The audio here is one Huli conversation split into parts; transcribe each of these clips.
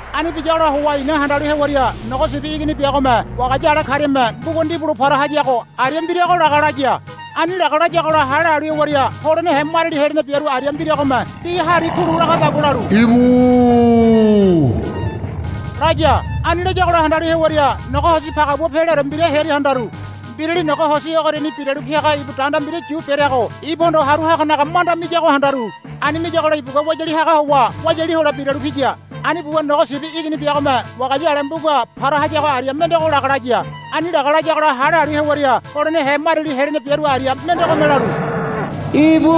Ani biyagola howa i̱na handalu hewaria Nogo Sibi Igini biagome wagaya ale kariame mbuga ndibulo para hayago aria mbirago laga laya. Ani laga layagola hale halu hewaria holenehe mariali helene biaru aria mbiragome bi hari kulu lagadagua lalu, Íbu, laya. Ani layagola handalu hewaria nogo hosi pagabua peleore mbira hearia handaru. Mbirali nogo hosi ogoriani biralu piaga ibu danda mbira yu bereago ibuhondo haru haganaga manda miyago handaru. Ani miyagola ibugua wayali haga howa wayali hole biralu piya. Ani buwa Nogo Sibi Igini biagome wagaya ale mbuga para hayago aria mendego laga laya. Ani laga layagola hale halu hewaria holenehe mariali helene biaru aria mendegome lalu, Íbu,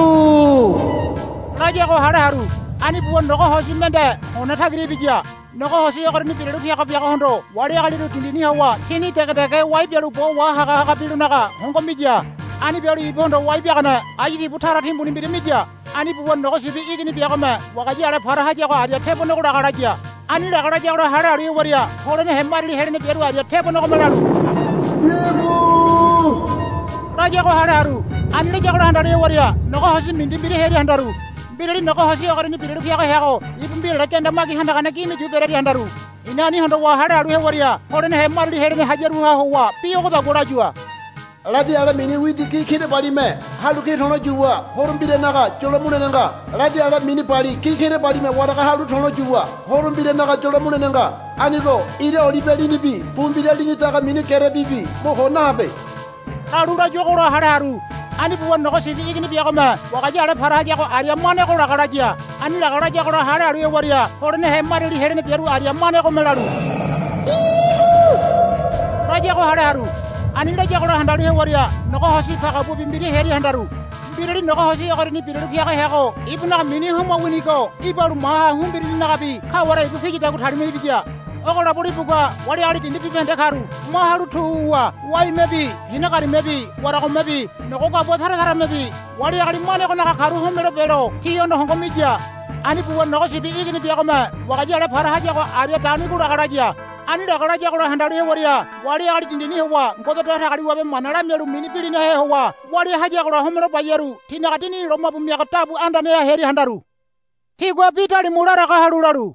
layago hale haru. Ani buwa nogo hosi mende hone tagira ibiya. Nogo hosi ogoriani biralu piaga biagohondo wali agaliru dindini howa tini dege dege wai bialu bo wahaga haga bilonaga hongo miya. Ani bialu ibuhondo wai biagane ayu tibu tara timbuni mbira miya. Ani buwa Nogo Sibi Igini biagome wagaya ale para hayago aria tebonego laga laya. Ani laga layagola hale halu hewaria holenehe mariali helene biaru aria tebonegome lalu, Íbu, layago hale haru. Ani layagola handalu hewaria nogo hosi mindi mbira hearia handaru. Mbirali nogo hosi ogoriani biralu piaga heago ibu mbirale genda magi handagane gime yu berearia handaru. I̱na ani hondowa hale halu hewaria holenehe mariali helene hayaruha howa bi ogodagua layua, Ladi ale mini widi gi kirabalime halu ki to̱lo yuwa horo mbiranaga yolo mulene nga. Ladi ale mini bali gi kirabalime waraga halu to̱lo yuwa horo mbiranaga yolo mulene nga. Anigo ira olibe linibi pu mbira lini daga mini gerebibi mo ko nahabe, lalu layuagola hale haru. Ani buwa Nogo Sibi Igini biagome wagaya ale para hayago aria manego laga laya. Ani laga layagola hale halu hewaria holenehe mariali helene biaru aria manegome lalu, Íbu, layago hale haru. Ani layagola handalu hewaria nogo hosi pagabuabi mbira hearia handaru. Mbirali nogo hosi ogoriani biralu piaga heago ibunaga mini Homa winigo ibalu maha Humbirininagabi kaware ibu piyadagua talima ibiya. Ogolabo ibugua wali ali dindi bibahende karu ma halu tu wuwa waimebi hina garimebi waragomebi nogo gabua tara taramebi wali agali manegonaga karu homelo belo tihondo hongo miya. Ani buwa Nogo Sibi Igini biagome wagaya ale para hayago aria daunigo laga laya. Ani laga layagola handalu hewaria wali agali dindini howa Ngode Datagaliwabe mana lamialu mini bilinahe howa walia hayagola homelo bayaru tinaga dinini lomabu miagane dabu andaneha hearia handaru. Tigua bi dalimu laraga halu lalu,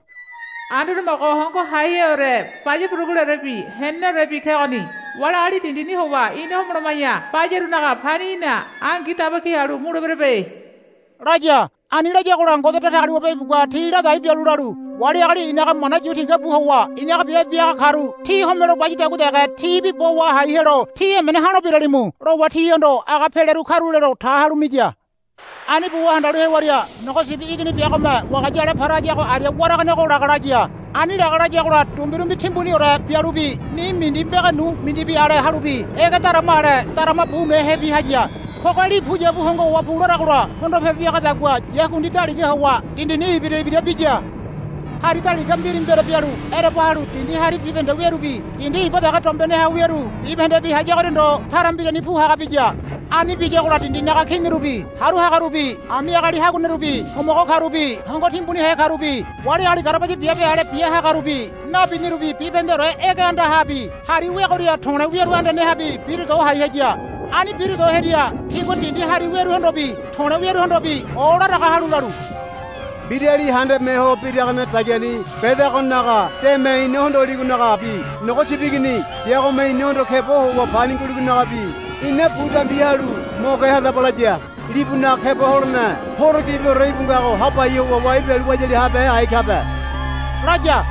Anduane Homogo Hongo Haiheore baya buruguleorebi heneneorebi kegoni. Wali agali dindini howa ina homoloma̱ya bayarunaga pani í̠na angi daba ki halu muleberebe, laya. Ani layagola Ngode Datagaliwabe ibugua ti ladai bialu lalu, Wali ali inaga i̱naga mana yu tigabu howa i̱naga biabe biahaga karu tí homole bayadagua dege tibi bo wahai helo tí emene ha̱lo biralimu, lowa tihondo aga peleru karulelo ta halu miya. Ani buwa handalu hewaria Nogo Sibi Igini biagome wagaya ale para hayago aria waraganego laga laya. Ani laga layagola dumbirumbi timbuniore bialubi ni mindi mbege nu mindibi ale halubi ege darama ale darama bumehebi haya. Poge li puyabu hongo howa pularagola hondopebe biagadagua yakundi daliga howa dindini ibira ibira biya. Hari daliga mbiri mbere bialu ereba halu dindi hari bibahende wearubi dindi iba dege dombeneha wiaru bibahendebi hayagoria ndo tara mbirani pu haga biya. Ani biyagola dindinaga kinirubi haru hagarubi ami agali haguanerubi homogo karubi hongo timbunihe karubi wali agali garabaya biabe ale bia hagarubi nabinirubi bibahendeore ege andahabi hari weagoria to̱le̱ wiaru andanehabi bira do hai haya. Ani bira do hearia tigua dindi hari wearuhondobi to̱le̱ wiaruhondobi olaraga halu lalu, Mbirali handame ho biragane dagiani bedagonaga deme ina hondoligonagabi Nogo Sibi Igini biagome inahondo keba howa pani nguligonagabi ina bu dambi halu mo ge hadaba, laya. Libunaga keba holene horo gibiore íbu ngago hapai howa wai bialu wayali habehe ai kabe, laya.